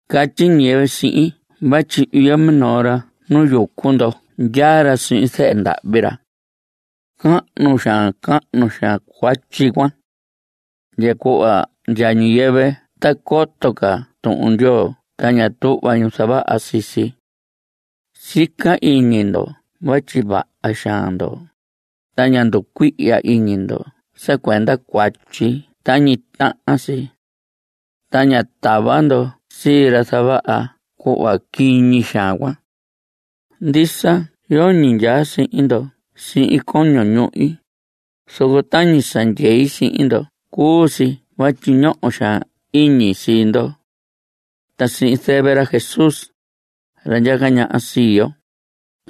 Catyi ñiyɨvɨ sihin vatyi iyo minoo ra nu yucu ndo ndyaa ra sihin zɨhɨ ndahvi ra. Cahnu xaan cahnu xaan cuatyi cuan. Ndya cuhva ndya ñiyɨvɨ ta coto ca Tuhun Ndyoo ta ña tuhva ñu zavaha sii si. Sica iñi ndo vatyi vaha xaan ndo, ta ña nducuihya iñi ndo sa cuenda cuatyi cuan tañi tahan si. Ta ña tava ndo sii ra zavaha cuhva quiñi xaan cuan. Ndisa yoñi ndyaa sihin ndo sihin coño ñuhi, zoco tañi sa ndyei sihin ndo cuu si vatyi ñoho xaan iñi sii ndo. Ta sihin zɨvɨ ra Jesús, ra ndyaca ñaha sii yo,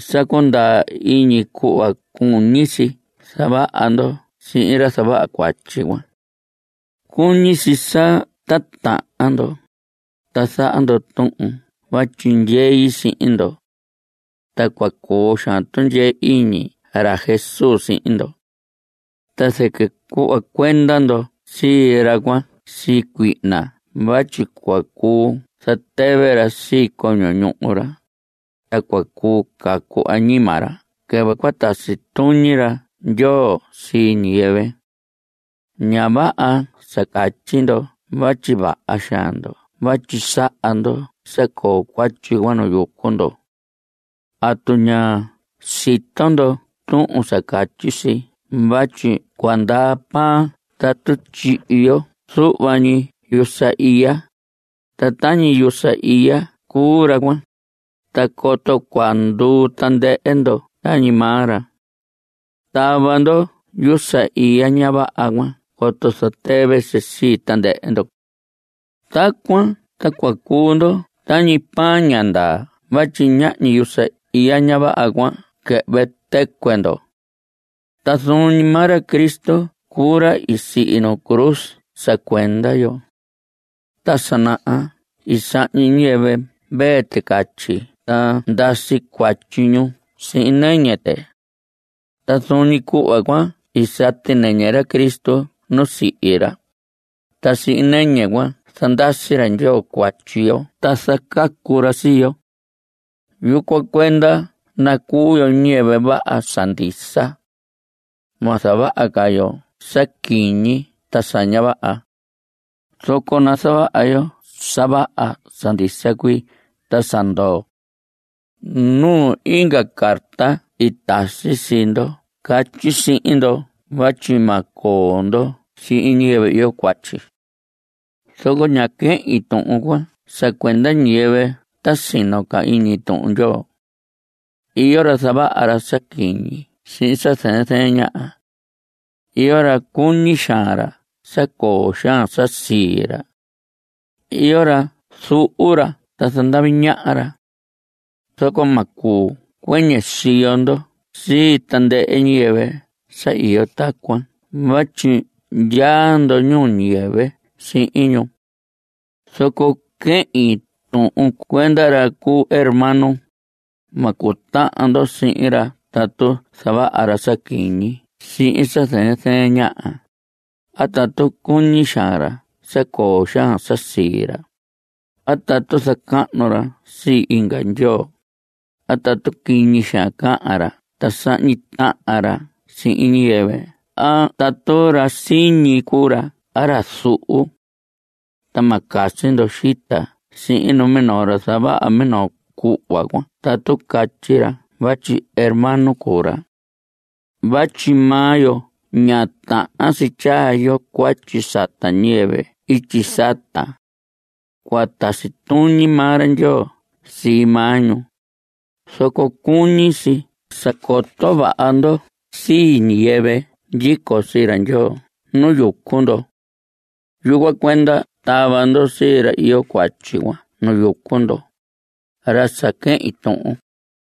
sa cundaa iñi cuhva cuñi si zavaha ndo sihin ra zavaha cuatyi cuan. Cuñi si sa titahan ndo. Ta zaha ndo tuhun vatyi ndyei sihin ndo. Ta cua coo xaan tundyee iñi ra Jesús sihin ndo. Ta zɨquɨ cuhva cuenda ndo sii ra cuan sii cuihna vatyi cua cuu zatɨvɨ ra sii coño ñuhu ra, ta cua cuu cacu añima ra quɨvɨ cua tasi tuñi ra Ndyoo sii ñiyɨvɨ. Ña vaha sa catyi ndo vatyi vaha xaan ndo vatyi saha ndo sa coo cuatyi cuan nu yucu ndo. ¿Atu ña sito ndo tuhun sa catyi si vatyi cua ndaa pan tatu tyihi yo zuhva ñi yusa iya? (Ta tañi yusa iya cuu ra cuan. Ta coto cua nduu tandɨhɨ ndo tañi maa ra.) Tava ndo yusa iya ña vaha cuan coto zatɨvɨ si sii tandɨhɨ ndo. Tacuan ta cua cuu ndo tañi pan ña ndaa vatyi ñahñi yusa iya ña vaha cuan cua quɨhvɨ tɨcuɨ ndo. Ta zuun ñi maa ra Cristo cuu ra i sihi nu cruz sa cuenda yo. Ta sa naha i sahñi ñiyɨvɨ mvee ticatyi ta ndasi cuatyi ñu sihin nɨñɨ tɨ. Ta zuun ñi cuhva cuan i sati nɨñɨ ra Cristo nu sihi ra, ta sihin nɨñɨ cuan zandasi ra Ndyoo cuatyi yo ta zacacu ra sii yo. Yucuan cuenda nacuu yo ñiyɨvɨ vaha sa ndisa. Ma zavaha ca yo sa quiñi ta sa ña vaha. Zoco nazavaha yo sa vaha sa ndisa cuii ta sa ndoo. Nu inga carta i tasi sii ndo i catyi sihin ndo vatyi ma coo ndo sihin ñiyɨvɨ iyo cuatyi. Zoco ñá quehin tuhun cuan sa cuenda ñiyɨvɨ ta sino ca iñi Tuhun Ndyoo. Iyo ra zavaha ra sa quiñi sihin sa zɨɨn zɨɨn ñaha. Iyo ra cuñi xaan ra sa coo xaan sa sii ra. Iyo ra zuhu ra ta zandavi ñaha ra. Zoco ma cuu cuɨñɨ siyo ndo sii tandɨhɨ ñiyɨvɨ sa iyo tacuan vatyi ndyaa ndo ñuu ñiyɨvɨ sihin ñu. Zoco quehin tuhun cuenda ra cuu hermano. Ma cutahan ndo sihin ra tatu zavaha ra sa quiñi sihin sa zɨɨn zɨɨn ñaha, a tatu cuñi xaan ra sa coo xaan sa sii ra, a tatu zacahnu ra sii inga ndyoo, a tatu quiñi cahan ra ta sahñi tahan ra sihin ñiyɨvɨ a tatu ra siñi cuu ra a ra zuhu. Ta ma casi ndo xita sihin numinoo ra zavaha minoo cuhva cuan tatu catyi ra vatyi hermano cuu ra. Vatyi maa yo ña tahan si tyaa yo cuatyi sata ñiyɨvɨ ityi sata. Cua tasi tuñi maa ra Ndyoo sii maa ñu. Zoco cuñi si sa coto vaha ndo sii ñiyɨvɨ ndyico sii ra Ndyoo nu yucu ndo. Yucuan cuenda tava ndo sii ra iyo cuatyi cuan nu yucu ndo, ra sa quehin tuhun.